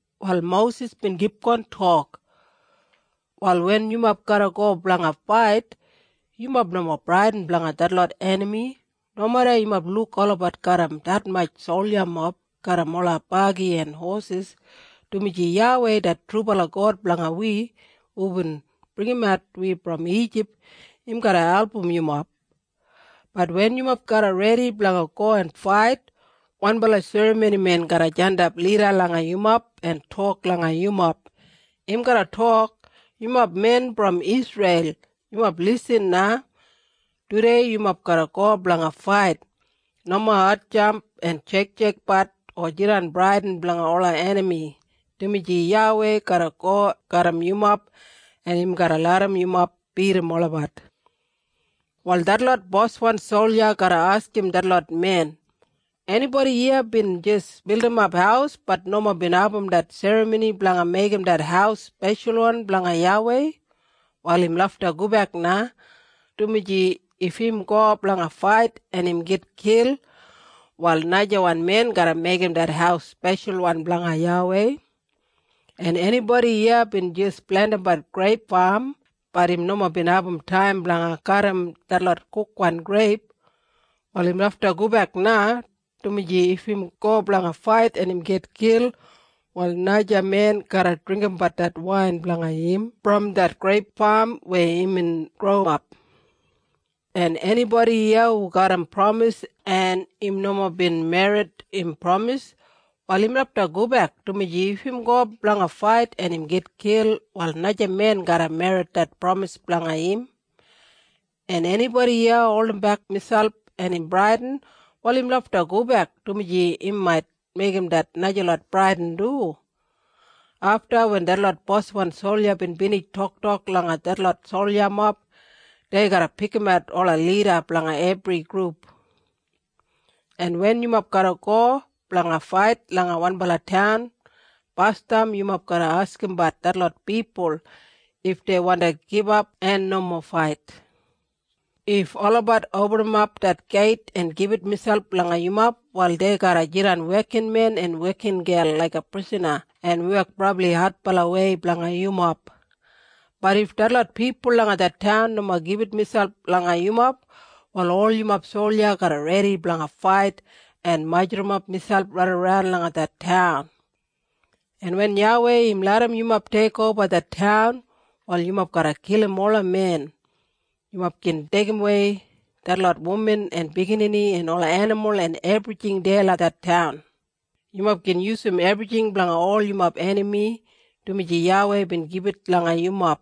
Wal Mosis bin kipgon tok, “Wal wen yumob garra go blanga fait, yumob nomo bradin blanga detlot enami, nomeda yumob luk olabat garram detmatj soljamob garram ola bagi en hosis, dumaji YAWEI det trubala God blanga wi, hubin bringimat wi brom Ijip, im garra album yumob. Bat wen yumob garra redi blanga go en fait, wanbala serramonimen garra jandap lida langa yumob en tok langa yumob. Im garra tok, ‘Yumob men brom Isreil, yumob lisin na. Tudei yumob garra go blanga fait. Nomo hatjamp en sheiksheikbat o jidan bradin blanga ola enami, dumaji YAWEI garra go garram yumob en im garra larram yumob bidim olabat.’ “Wal detlot boswan solja garra askim detlot men, ‘Enibodi iya bin jis bildimap haus bat nomo bin abum det serramoni blanga meigim det haus speshalwan blanga YAWEI? Wal im lafta gobek na, dumaji if im go blanga fait en im gitkil, wal najamen garra meigim det haus speshalwan blanga YAWEI. En enibodi iya bin jis plentimbat greip fam bat im nomo bin abum taim blanga kadim detlot kukwan greip? Wal im lafta gobek na, dumaji if im go blanga fait en im gitkil, wal najamen garra dringgimbat det wain blanga im brom det greip fam weya imbin growap. En enibodi iya hu garram pramis, en im nomo bin merrit im pramis? Wal im lafta gobek, dumaji if im go blanga fait en im gitkil, wal najawan men garra merrit det pramis blanga im. En enibodi iya holdimbek miselp en im bradin? Wal im lafta gobek, dumaji im mait meigim det najalot bradin du.’ Afta wen detlot boswan solja bin binij toktok langa detlot soljamob, dei garra pikimat ola lida blanga ebri grup. “En wen yumob garra go blanga fait langa wanbala taun, basdam yumob garra askimbat detlot pipul if dei wandi gibap en nomo fait. If olabat opinimap det geit en gibit miselp langa yumob, wal dei garra jidan wekinmen en wekingel laiga prisana en wek brabli adbalawei blanga yumob. Bat if detlot pipul langa det taun nomo gibit miselp langa yumob, wal ol yumob solja garra redi blanga fait en majurrumap miselp raidaran langa det taun. En wen YAWEI im larram yumob teikoba det taun, wal yumob garra kilim ola men. Yumob gin deigimwei detlot wuman en biginini en ola enimul en ebrijing deya langa det taun. Yumob gin yusum ebrijing blanga ol yumob enami, dumaji YAWEI bin gibit langa yumob.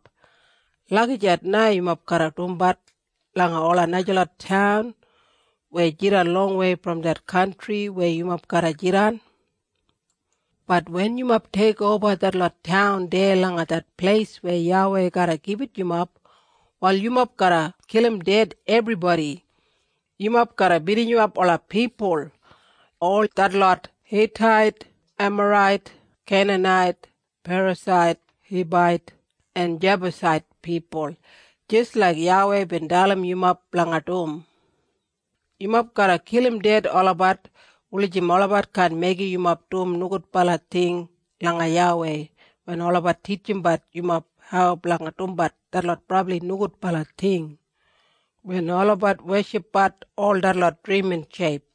Lagijat na yumob garra dumbat langa ola najalot taun weya jidan longwei brom det kantri weya yumob garra jidan. “Bat wen yumob teikoba detlot taun deya langa det pleis weya YAWEI garra gibit yumob, wal yumob garra kilim ebribodi ded. Yumob garra binijimap ola pipul, ol detlot Hitait, en Emarait, en Keinanait, en Perasait, en Hibait en Jebusait pipul, jis laik YAWEI bin dalim yumob blanga dum. Yumob garra kilim olabat ded, wulijim olabat kaan meigim yumob dum nogudbala ting langa YAWEI wen olabat titjimbat yumob hau blanga dumbat detlot brabli nogudbala ting wen olabat weshipbat ol detlot drimin sheip.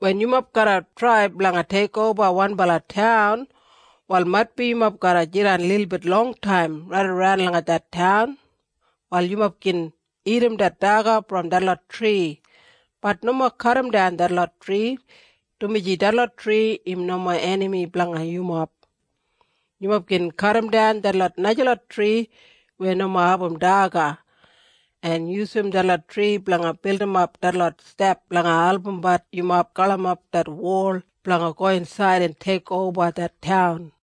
“Wen yumob garra trai blanga teikoba wanbala taun wal maitbi yumob garra jidan lilbit longtaim raidaran langa det taun. Wal yumob gin dagat det daga brom detlot tri, bat nomo kadimdan detlot tri, dumaji detlot tri im nomo enami blanga yumob. Yumob gin kadimdan detlot najalot tri weya nomo abum daga, en yusum detlot tri blanga bildimap detlot step blanga albumbat yumob galimapbat det wol blanga go insaid en teikoba det taun.”